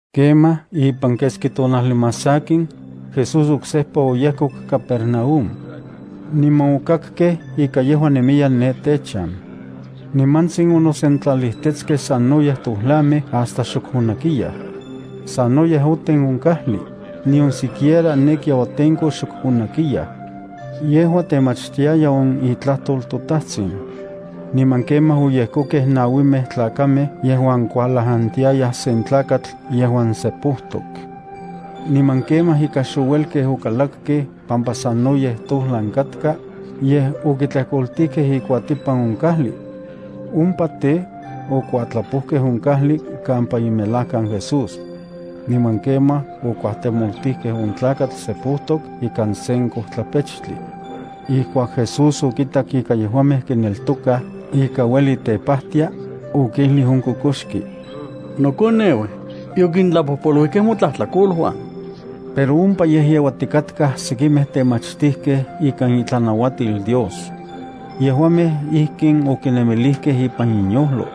Kemaj ipan keski tonajli más sakin, Jesús oksejpa oyejkok Capernaúm. Niman okakkej ika yejua nemiya ne techan. Nimantsin onosentlalijtetskej sanoyej tojlamej hasta xok onakiyaj. Sanoyej oten on kajli, nion siquiera ne kiauatenko xok onakiyaj. Yejua temachtiaya on itlajtol toTajtsin. Niman kemaj oyejkokej nauimej tlakamej yejuan kualajantiayaj sen tlakatl yejuan sepojtok. Niman kemaj ika xouelkej okalakkej pampa sanoyej tojlan katka, yej okitlejkoltijkej ikuatipan on kajli. Ompa tej, okuatlapojkej on kajli kampa imelajkan Jesús. Niman kemaj okuajtemoltijkej on tlakatl sepojtok ikan sen kojtlapechtli. Ijkuak Jesús okitak ika yejuamej kineltokaj ika ueli tepajtia, okijlij on kokoxki: —Nokoneu, yokintlapojpoluijkej motlajtlakoluan. Pero ompa yejyeuatikatkaj sekimej temachtijkej ikan itlanauatil Dios. Yejuamej ijkin okinemilijkej ipan inyojlo: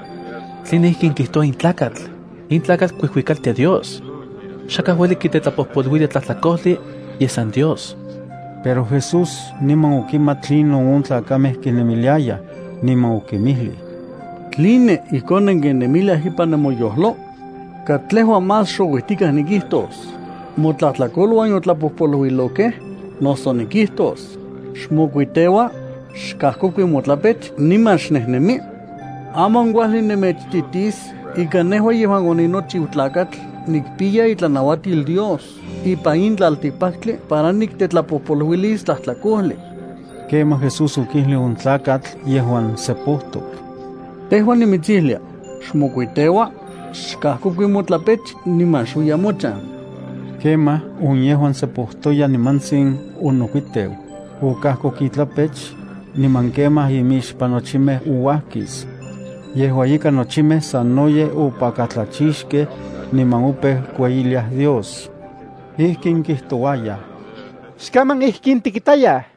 “¿Tline ijkin kijtoua in tlakatl? In tlakatl kuijuikaltia Dios. Xakaj ueli kitetlapojpoluilia tlajtlakojli, yej san Dios.” Pero Jesús niman okimat tlinon on tlakamej kinemiliayaj, niman okinmijlij: —¿Tline, ijkon nenkinemiliaj ipan nemoyojlo? ¿Katlejua más xouijtikaj nikijtos: “Motlajtlakoluan yotlapojpoluilokej”, noso nikijtos: “Xmokuiteua, xkajkokui motlapech niman xnejnemi”? Aman kuajli nemechititis ika nejua yejuan oninochiu Tlakatl nikpiya itlanauatil Dios ipan in tlaltikpaktli para niktetlapojpoluilis tlajtlakojli. Kemaj Jesús okijlij on tlakatl yejuan sepojtok: —Tejua nimitsijlia: Xmokuiteua, xkajkokui motlapech niman xuiya mochan. Kemaj on yejuan sepojtoya nimantsin onokuiteu, okajkoku itlapech, niman kemaj imixpan nochimej ouajkis. Yejua ika nochimej sanoyej opakatlachixkej, niman opeu kueyiliaj Dios. Ijkin kijtouayaj: —Xkaman ijkin tikitayaj.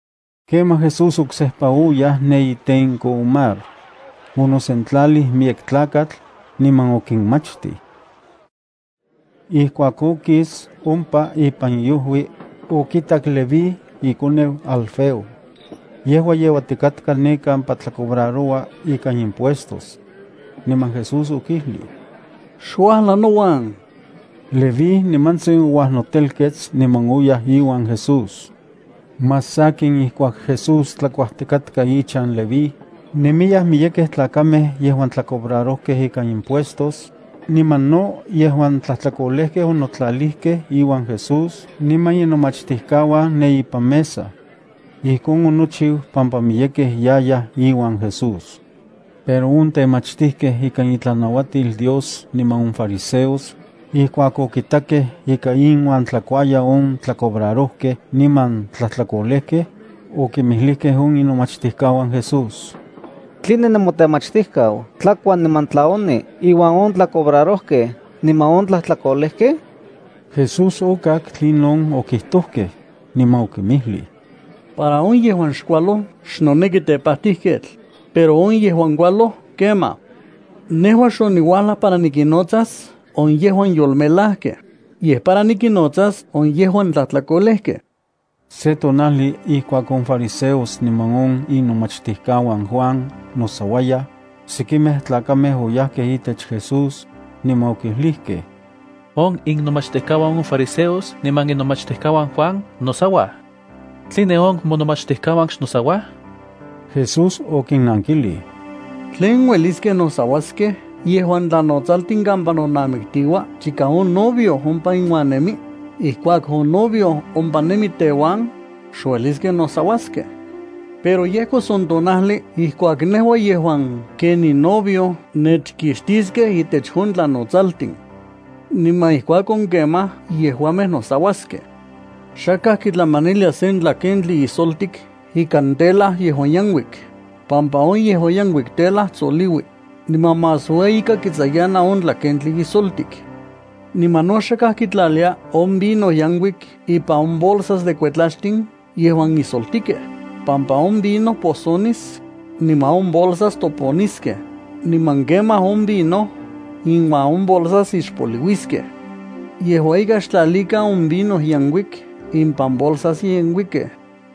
Kemaj Jesús oksejpa oyaj ne itenko on mar. Onosentlalij miyek tlakatl, niman okinmachtij. Ijkuak okis ompa ipan iojui, okitak Leví ikoneu Alfeo. Yejua yeuatikatka ne kampa tlacobraroua ika impuestos. Niman Jesús okijlij: —Xuajla nouan. Leví nimantsin ouajnotelkets niman oyaj iuan Jesús. Más sakin ijkuak Jesús tlakuajtikatka ichan Leví, nemiyaj miyekej tlakamej yejuan tlacobrarojkej ikan impuestos niman no yejuan tlajtlakolejkej onotlalijkej iuan Jesús niman inomachtijkauan ne ipan mesa. Ijkon onochiu pampa miyekej yayaj iuan Jesús. Pero on temachtijkej ikan itlanauatil Dios niman on fariseos, ijkuak okitakej ika inuan tlakuaya on tlacobrarojkej niman tlajtlakolejkej, okinmijlijkej on inomachtijkauan Jesús: —¿Tline nemotemachtijkau tlakua niman tlayoni inuan on tlacobrarojkej niman on tlajtlakolejkej? Jesús okak tlinon okijtojkej, niman okinmijlij: —Para on yejuan xkualoj xnoneki tepajtijketl, pero on yejuan kualoj kemaj. Nejua xoniuajlaj para nikinnotsas on yejuan yolmelajkej, yej para nikinnotsas on yejuan tlajtlakolejkej. Se tonajli, ijkuak on fariseos niman on inomachtijkauan Juan nosauayaj, sekimej tlakamej oyajkej itech Jesús, niman okijlijkej: —On innomachtijkauan on fariseos niman inomachtijkauan Juan nosauaj. ¿Tline on monomachtijkauan xnosauaj? Jesús okinankijlij: —¿Tlen ueliskej nosauaskej yejuan tlanotsaltin kampa nonamiktiua chika on novio ompa inuan nemi? Ijkuak on novio ompa nemi teuan, xueliskej nosauaskej. Pero yejkos on tonajli ijkuak nejua yejuan ken ninovio nechkixtiskej intech on tlanotsaltin. Niman ijkuakon kemaj yejuamej nosauaskej. ’Xakaj kitlamanilia sen tlakentli ijsoltik ikan tela yejuan yenkuik, pampa on yejuan yenkuik tela tsoliui, niman más ueyika kitsayana on tlakentli ijsoltik. Niman no xakaj kitlalia on vino yenkuik ipan on bolsas de kuetlaxtin yejuan ijsoltikej, pampa on vino posonis, niman on bolsas toponiskej, niman kemaj on vino iuan on bolsas ixpoliuiskej. Yejua ika xtlalikan on vino yenkuik ipan bolsas yenkuikej.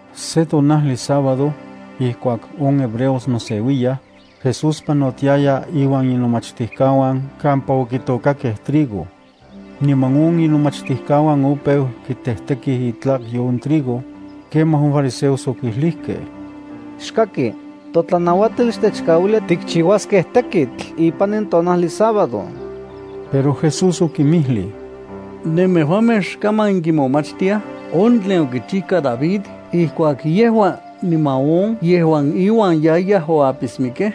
Se tonajli sábado, ijkuak on hebreos noseuiyaj, Jesús panotiaya inuan inomachtijkauan kampa okitôkakej trigo. Niman on inomachtijkauan opeu kitejtekij itlakyo on trigo. Kemaj on fariseos okijlijkej: —Xkaki. Totlanauatil xtechkauilia kichiuaskej on tekitl ipan in tonajli sábado. Pero Jesús okinmijlij: —¿Nemejuamej xkaman nenkimomachtiaj on tlen okichijka David ijkuak yejua niman on yejuan iuan yayaj oapismikej?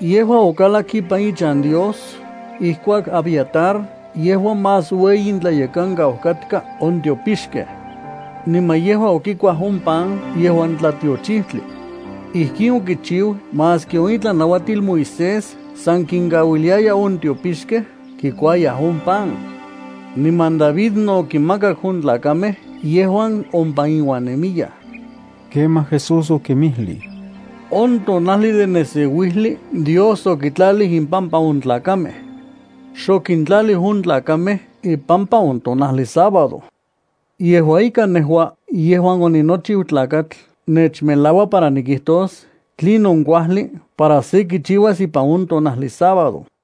Yejua okalak ipan ichan Dios ijkuak Abiatar yejua más ueyi intlayekankau katka on tiopixkej. Niman yejua okikuaj on pan yejuan tlatiochijtli. Ijkin okichiu maski on itlanauatil Moisés san kinkauiliaya on tiopixkej kikuayaj on pan. Niman David no okinmakak on tlakamej yejuan ompa iuan nemiyaj. Kemaj Jesús okinmijlij: —On tonajli de neseuijli Dios okitlalij impampa on tlakamej. Xokintlalij on tlakamej ipampa on tonajli sábado. Yejua ika nejua yejuan oninochiu Tlakatl nechmelaua para nikijtos tlinon kuajli para se kichiuas ipan on tonajli sábado.